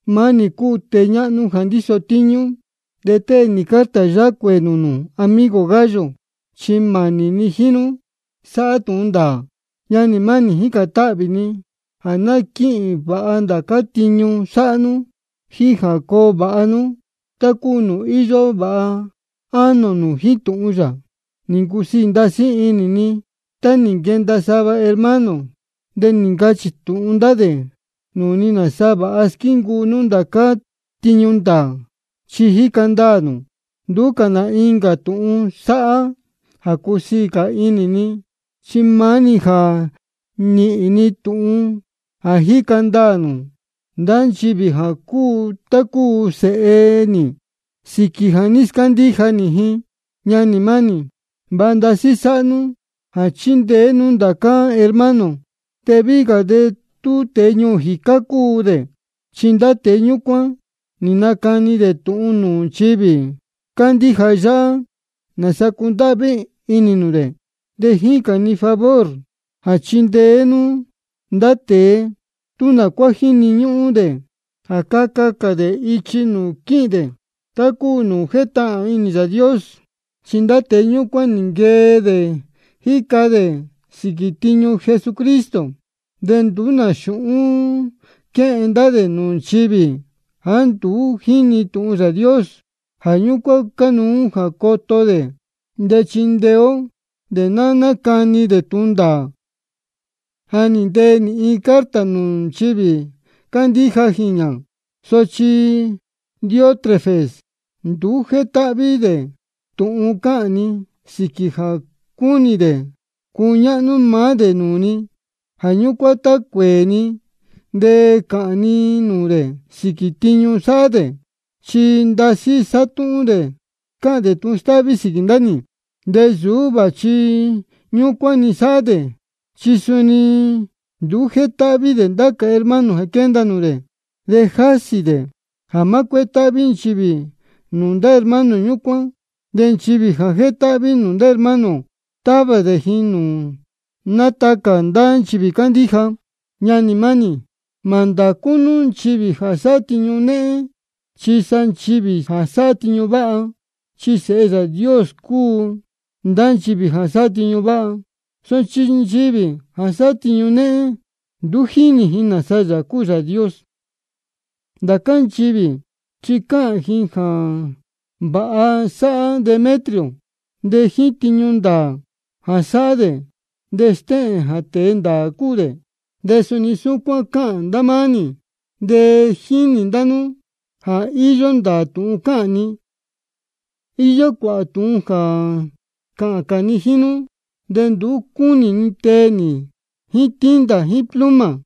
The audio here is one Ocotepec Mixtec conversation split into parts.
Maá nī cúu tēe ñáhnú jā ndíso tíñú, de tée nī carta yáhá cuēē nūū nū, amigo Gayo, chi mānī ni jíín nú sáhá tūhun ndāā. Ñanī mánī, jícān táhvī ni jā ná quíhīn vāha ndācá tiñu sáhá nú, jíín jā coo vāha nú, tá cúu nūū íyó vāha ánō nū jíín tūhun yā. Nī ncusiī ndasí inī ni tá nī nquenda sava hermano de nī ncachī tūhun ndá dē nūū ni nāsa vāha squíncuu nú ndācá tiñu ndāā, chi jíca ndaā nū. Nduú cā nā incā tūhun sáhá jā cúsiī cā inī ni, chi maá-ni jā níhīn ni tūhun jā jíca ndaā ndá nchivī jā cúu tá cúu sēhe nī sīquī jā ní scándíja nī ji. Ñanī mánī, vāha ndasí sáhá nú jā chíndeé nú ndācá hermano, de víhí cā tú tēe ñuū jīcá cúu dē. Chi ndá tēe ñúcuán nī nacani dē tūhun nūū nchivī cándíja yáhá, nāsa cúndáhví inī nū dē. De jícān ni favor jā chindeé cā nū ndá dē, tú nā cuá jíni ñúhún dē jā caca cā dē ichi nūū quíhīn dē, tá cúu nūū jétahān inī Yāā Dios. Chi ndá tēe ñúcuán nī nquee dē jíca dē sīquī tiñu Jesucristo. De nduú nā xūhún quéhen ndá dē nūū nchivī jāá nduú jínī tūhun Yāā Dios. Jā ñúcuán cánuú jā coto ó dē, de chindeé ó dē jā nácani dē tūhun ndāā. Ja nī ntee nī iin carta nūū nchivī cándíja jīñā. Sochi Diótrefes nduú jétáhví dē tūhun cáhān ni, sīquī jā cúnī dē cuñáhnú maá dē nūū ji. Jā ñúcuán de tá cuēē ni de cāhān ni nūū dē sīquī tiñu sáhá dē, chi ndasí sátúhún dē de cáhān dē tūhun stáhví sīquī ndá nī. De nsūú vāchi ñúcuán-ni sáhá dē, chi suni nduú jétáhví dē ndācá hermano jā quénda nūū dē, de jásī dē jā má cuétáhví nchivī nūū ndá hermano ñúcuán. De nchivī jā jétáhví nūū ndá hermano, távā dē ji nūū nátacā ndá nchivī cándíja. Ñanī mánī, mā ndācú nú nchivī jā sáhá tiñu néhén, chi sa nchivī jā sáhá tiñu váha. Chi sēhe Yāā Dios cúu ndá nchivī jā sáhá tiñu váha. Sochi nchivī jā sáhá tiñu néhén, nduú jínī ji nāsa Yāā cúu Yāā Dios. Ndācá nchivī chi cáhān ji jā vāha sáhá Demetrio. De jíín tiñu ndāā jā sáhá dē, de stéhēn jā tēe ndāā cúu dē. De suni súcuán cáhān ndá máá nī, de jínī ndá nú jā íyó ndāā tūhun cáhān ni. Iyó cuāhā tūhun jā cāhān cā ni jíín nú, de nduú cúnī ni tee nī jíín tinta jíín pluma.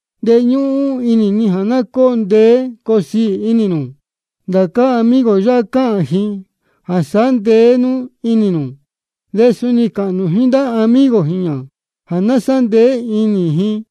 De ñúhún inī ni jā ná cóo ndeé coo siī inī nū. Ndācá amigo ō yáhá cáhān ji jā sāhá ndeé inī nū. De suni cāhān nū jíín ndācá amigo jīñā jā sāhá ndeé inī ji.